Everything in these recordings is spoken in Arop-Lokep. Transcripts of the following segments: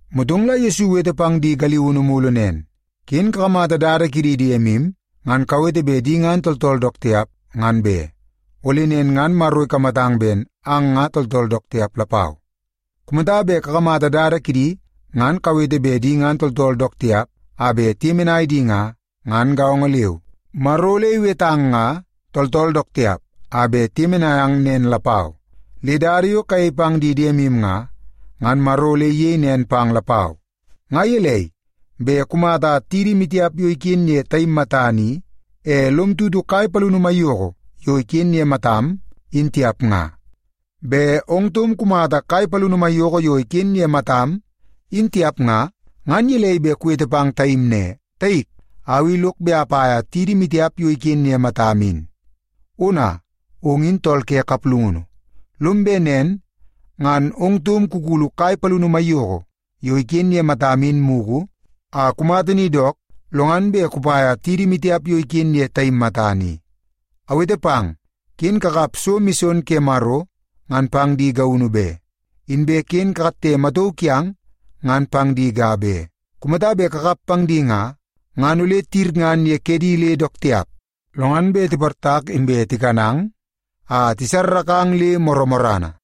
Motong la Yesu iwete pang di galiunu mulu nen, “Ken kakamata dada kidi diemu ngan kawete bet di ngan tooltool dook tiap, ngan be. Ole nen ngan Maro ikamatang ben ang nga tooltool dook tiap lapau. Kumata bet kakamata dada kidi ngan kawete bet di ngan tooltool dook tiap a bet tiyemenai di nga, ngan gaongo leu, Maro ole iwetang nga tooltool dook tiap a bet iyemenai ang nen lapau. Le dada yo kayei pang di diemu nga, ngan Maro ole iyei nen pang lapau. “Nga gelei bet kumata tidi maitiap yo iken ye taim matana i, e lom tutu kai palini maiyoko yo iken ye matam, in tiap nga? Bet ong taum kumata kai palini maiyoko yo iken ye matam, in tiap nga, ngan gelei bet kuwete pang taim ne, ‘Taik, au i lok bet apaia tidi maitiap yo iken ye matam in.’ Ona, ong in tool ke kaplungunu! Lom bet nen ngan ong taum kukulu kai palini maiyoko yo iken ye matam in mugu a kumata ni dook, lo ngan bet kupaia tidi maitiap yo iken ye taim matana i. “Awete pang, ken kakap so mison ke Maro ngan pang di gaunu be, inbe ken kakatte matauu kiang ngan pang di ga be. Kumata bet kakap pang di nga, ngan ole tiyirngan ye kedi le dook tiap, lo ngan bet tiportak inbe tikanang a tisarrakang le morrana.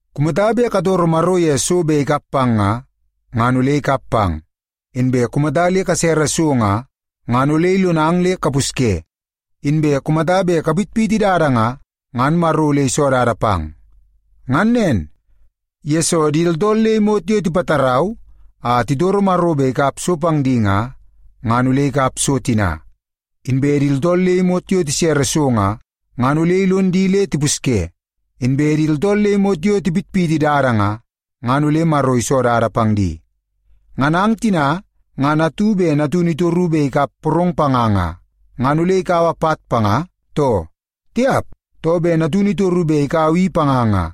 “Kumata bet katoro Maro ye so bet ikap pang nga, ngan ole ikap pang. Inbe kumata le kasere so nga, ngan ole ilonang le kapusye. Inbe kumata bet kapitpiti dada nga, ngan Maro ole iso dada pang. Ngan nen, yesoo di tooltool le imot yo tipatarau a titoro Maro bet ikap so pang di nga, ngan ole tikap so tina. Inbe di tooltool le imot yo tisere so nga, ngan ole ilon di le tipusye. Inbe di tooltool le imot yo tipitpiti dada nga, ngan ole Maro iso dada pang di. “Ngan ang tina ngan atu bet natunu itoru bet ikap porong panga nga, ngan ole ikaua pat panga, too? Tiap! Too, bet natunu itoru bet ikaua i panga nga,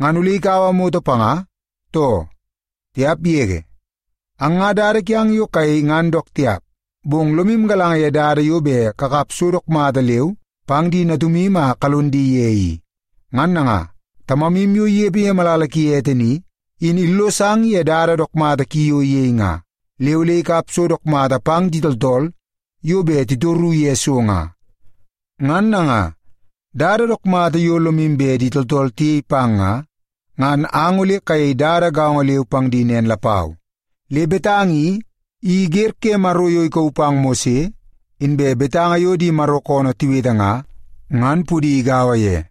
ngan ole ikaua moto panga, too? Tiap yege! Ang nga dada kiang yo kayei ngan dook tiap, bong lomu galanga ye dada yo bet kakap so dook mata leu pang di natumu a kalon di ye i. Ngan nanga, Tamamu yo inepe ye malala ki ete ni, in illosang ye dada dook mata ki yo iyei nga, le ole ikap so dook mata pang di tooltool yo bet titoru ye so nga. Ngan nanga, dada dook mata yo lomu bet di tooltool tiyei pang nga, ngan ang ole kayei dada gaongo leu pang di nen lapau. Le betanga i, in wer ke Maro yo ikauu pang Mose, inbe betanga yo di Maro koonoo tiwete nga, ngan pudi igaua ye.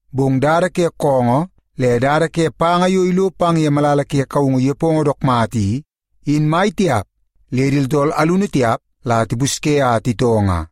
Bong dada ke koongoo le dada ke panga yo ilo pang ye malala ke kaungu nepongo dook mata i, in mai tiap le di tooltool alunu tiap la tipusye a titoo nga.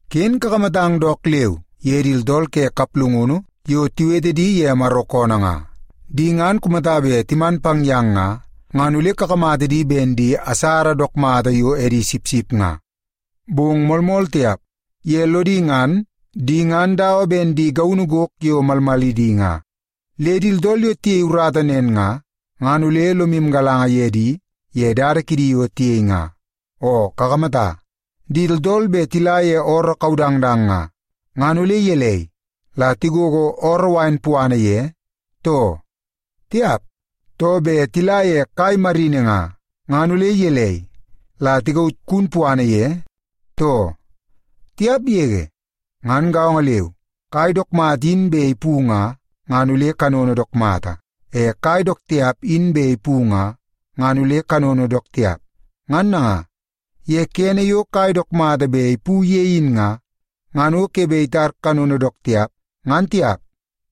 “Ken kakamatang dook leu ye di tooltool ke kaplungunu yo tiwete di ye Maro koonoo nga. Di ngan kumata bet timan pang yang nga, ngan ole kakamata di ben di asara dook mata yo edi sipsip nga, bong moolmool tiap, ye lodi ngan di ngan dawa ben di gaunu gok yo malmalidi nga. Le di tooltool yo tiyei urata nen nga, ngan ole lomu galanga ye di ye dada kidi yo tiyei nga. Oo kakamata, di tooltool bet tila ye ooroo kaudangdang nga, ngan ole gelei, la tigogo ooroo wain puana ye, too? Tiap! Too, bet tila ye kai marini nga, ngan ole gelei, la tikaut kun puana ye, too? Tiap yege! Ngan gaongo leu, kai dook mata in bet ipu nga, ngan ole kanono dook mata. E kai dook tiap in bet ipu nga, ngan ole kanono dook tiap. Ngan nanga, ye kene yo kai dook mata bet ipu ye in nga, ngan o ke bet itar kanono dook tiap, ngan tiap.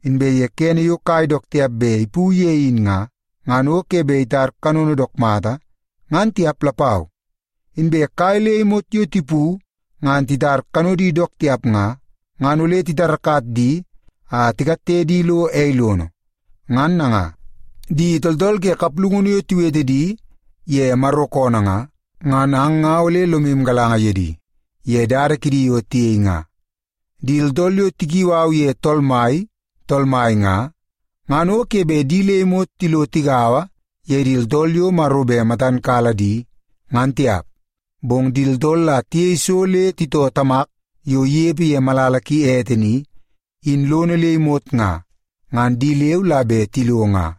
Inbe kene yo kai dook tiap bet ipu ye in nga, ngan o ke bet itar kanono dook mata, ngan tiap lapau. Inbe kai le imot yo tipu ngan titar kanodi dook tiap nga, ngan ole titarakat di a tikatte di lo ei lono. Ngan nanga, di tooltool ke kaplungunu yo tiwete di ye Maro koonoo nga, ngan ang nga ole lomu galanga ye di ye dada kidi yo tiyei nga.” “Di tooltool yo tikiu au ye ‘Tool Mai, Tool Mai’ nga, ngan o ke bet di le imot tilo tigaua ye di tooltool yo Maro bet matan kala di, ngan tiap. Bong di tooltool la tiyei so le titoo Tamak yo inepe ye malala ki ete ni, in lono le imot nga, ngan di leu la bet tilo nga.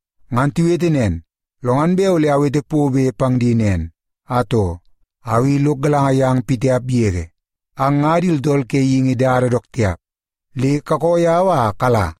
Ngan tiwete nen, lo ngan bet ole awete pobe pang di nen, ‘Atoo, au i lok galanga yang pitiap yege. Ang nga di tooltool ke geingi dada dook tiap, le kakoo yau a kala!’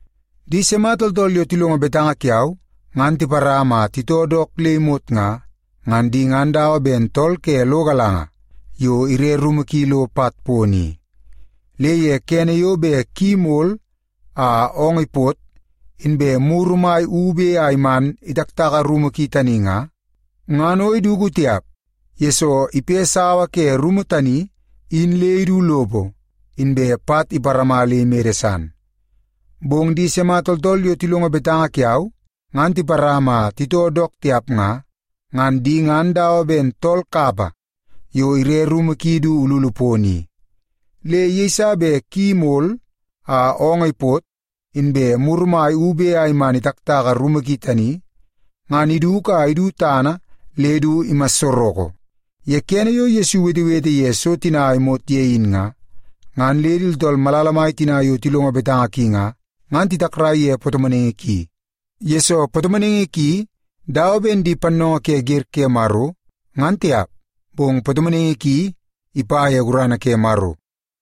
“Di sima tooltool yo tilongo betanga kiau, ngan tiparama a titoo dook le imot nga, ngan di ngan dawa ben tool ke lo galanga yo ire rumu ki lo pat pono i. Le ye kene yo bet ki imol a oongoo ipot, inbe muru mai ube a iman itaktaka rumu ki tani nga, ngan o iduku tiap. Yesoo, ipe sawa ke rumu tani in le idu lopo inbe pat iparama le imede san. Bong di sima tooltool yo tilongo betanga kiau, ngan tiparama a titoo dook tiap nga, ngan di ngan dawa ben tool kapa yo ire rumu ki du ululu pono i. Le yeiso bet ki mol a oongoo ipot, inbe muru mai ube a iman itaktaka rumu ki tani, ngan iduku a idu tana le du imassoroko.” Ye kene yo Yesu iwetewete ye so tina a imot ye in nga, ngan le di tooltool malala mai tina yo tilongo betanga ki nga, ngan titakrai ye patomonaingi ki, yesoo patomonaingi ki dawa ben di pannoongoo ke wer ke Maro, ngan tiap, bong patomonaingi ki ipa ye gurana ke Maro.